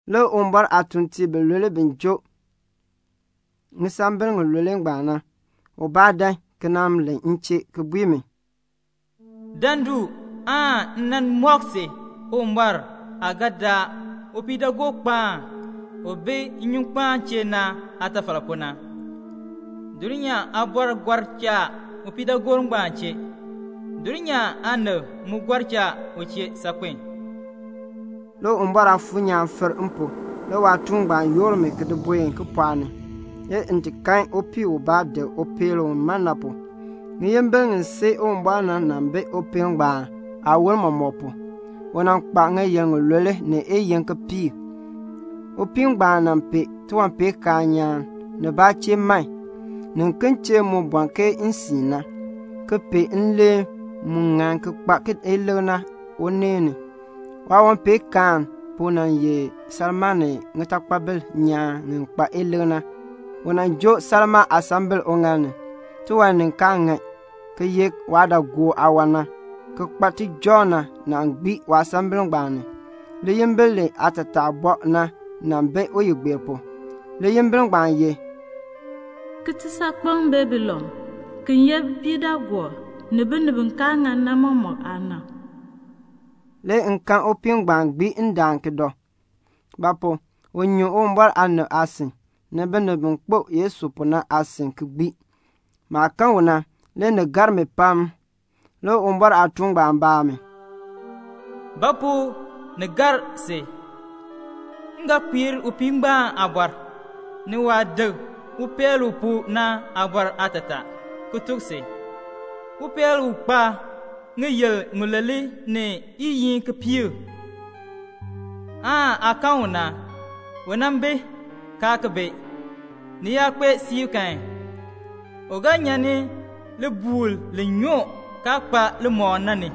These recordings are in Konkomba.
Le Uwumbɔr aatuuntiib bilule bi joo ŋisambil ŋilule ngbaan na ubaa dan ki nan len m chee ki bui mi, "Dan du, m nan mɔk si Uwumbɔr aah ga daa upiidaagookpaan u bi nnyunkpaan chee na aatafal pu na. Dulnyaa aabɔrb gɔr cha upiidaagoor ngbaan chee. Dulnyaa aanib mu gɔr cha u chee saakpen." Le Uwumbɔr Aafuur nyaan fir m pu, le waatuun ngbaan yoor mi ki di buen kipɔɔk ni. Le m kan upii ubaa dik upeel u man na pu. Ŋiyimbil ŋi sii Uwumbɔr na bi upeel ngbaan aawon mɔmɔk pu. U kpa ŋiyil ŋilule ni iyiin kipiik. Upii ngbaan pee tiwanpeenkaan nyaan, nibaa chee man, niken chee mu bɔn ke nsiin na, ki pee nleen mu ŋan ki kpa ilik na uneen ni. Waawanpeenkaan pu nan ye salmaa ni ŋitakpabil nyaan ŋi kpa ilik na. U joo salmaa aasambil uŋaal ni. Tiwan ni kaa ŋan, ki ye waadaagook aawan na, ki kpa tijɔŋ na gbii waasambil ngbaan. Liyimbil li kpa laatataa li bɔɔ na nan bi uyigbeer pu. Liyimbil ngbaan ye: "Kitisaakpeŋ Babilon u ye bipiidaagoob ni binib bi kaa ŋan na mɔmɔk aana." Le m kan upii ngbaan gbii ki dɔ; ba pu? u nyu Uwumbɔr aanib aasin, ni binib bi kpo Yesu pu na aasin ki gbii. Maah kan u na, le ni gar mi pam. Le Uwumbɔr aatuun ngbaan baa mi, "Ba pu ni gar si? M ga kpiir upii ngbaan aabɔr, ni waah dik upeel u pu na aabɔr aatataa, ki tuk si. Upeel ngbaan u kpa ŋiyil ŋilule ni iyiin kipiik na, u aa kan u na, u nan bi, kaa ki bi. Ni yaa kpee siib kan, u ga nyan libuul li nyoo kaa kpa limɔk na ni,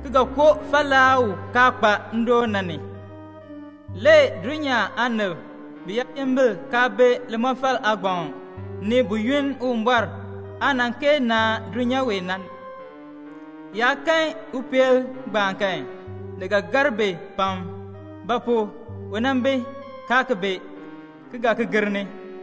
ki ga koo falaa u kaa kpa ndoon na ni. Le dulnyaa aanib biyaayimbil kaa bi limɔfal aagbaŋ ni buyoonn Uwumbɔr aah kaa nan kee naan dulnyaa wee na, bi yaa kan upeel ngbaan kan, ni ga gar bi pam; ba pu? u nan bi, kaa ki bi, ki ga ki gir ni.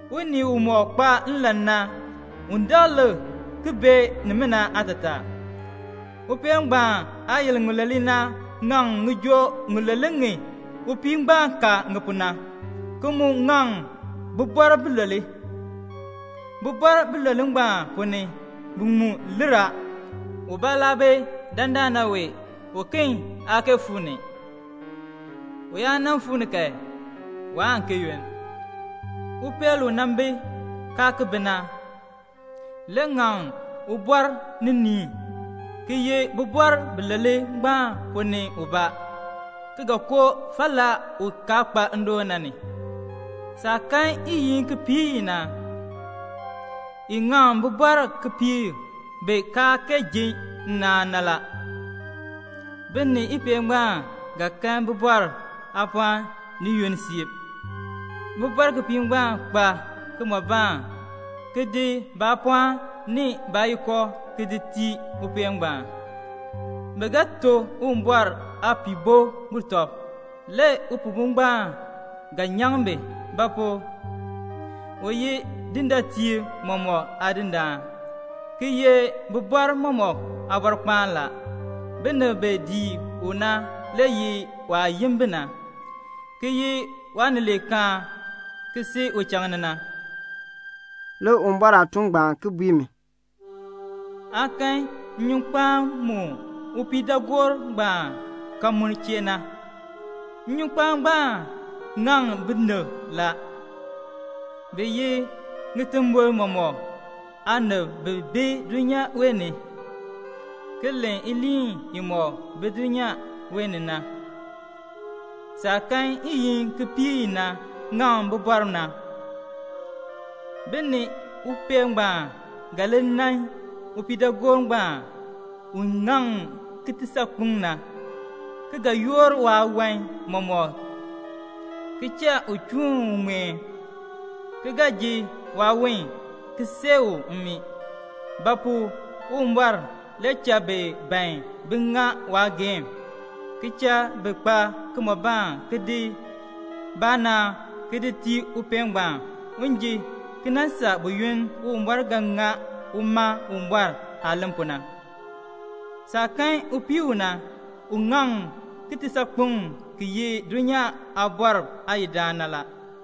"Unii umɔk kpa nlan na, un dak ki lik ki bee nimina aatataa. Upeel ngbaan aayil ŋilule na ŋaŋ ŋijoo ŋilule ŋi upii ngbaan ka ŋi pu na, ki mu ŋaŋ bibɔrb bilule. Bibɔrb bilule ngbaan, bi ponn ni biŋmu lir a, ubaa laa bi dandana wee, uken aa kee fuu ni. U yaa fuu ni kan, waan ki yunn. Upeel ngbaan u nan bi, kaa ki bi na, le ŋaŋ ubɔr niniin, ki ye bibɔrb bilule ngbaan ponn ni ubaa, ki ga koo falaa u kaa kpa ndoon na ni. "Saah kan iyiin kipiik i na, i ŋaŋ bibɔrb kipiik bi kaa kee ji nnaan na. Bi ni upeel ngbaan ga kan bibɔrb aapɔɔn ni yunn siib. Bibɔrb kipiik ngbaan kpa kimɔbaan, ki di baapɔɔn ni baayiko ki di tii upeel ngbaan. Bi ga to Uwumbɔr Aapihbo butɔb. Le Upihbo ngbaan ga nyaŋ bi; ba pu? u ye dindaatiib mɔmɔk Aadindaan, ki ye bibɔrb mɔmɔk Aabɔrkpaan. Binib bi dii u na le ye waah yin bi na, ki ye waanileekaan, ki si uchaŋ ni la." Le Uwumbɔr aatuun ngbaan bui mi, "Aa kan nnyunkpaan mu upiidaagoor ngbaan kal mu chee na. Nnyunkpaan ngbaan ŋaŋ binib la. Bi ye ŋitimbol mɔmɔk aanib bi bi dulnyaa wee ni, ki len iliin imɔk bi dulnyaa wee ni na. Saah kan iyiin kipiik i na, i ŋaŋ bibɔrb na, bi ni upeel ngbaan ga li nan upiidaagoor ngbaan u ŋaŋ kitisaakpeŋ na, ki ga yoor waawan mɔmɔk ki cha u chuun u ŋmeen, ki ga ji waawon ki see u mmii; ba pu? Uwumbɔr le cha bi ban bin ŋa waageehn, ki cha bi kpa kimɔbaan ki di baanaan ki di tii upeel ngbaan un ji ki nan saa buyoonn Uwumbɔr ga ŋa uma Uwumbɔr aah len pu na. "Saah kan upii u na, u ŋaŋ kitisaakpeŋ ki ye dulnyaa aabɔrb aayidaan na la."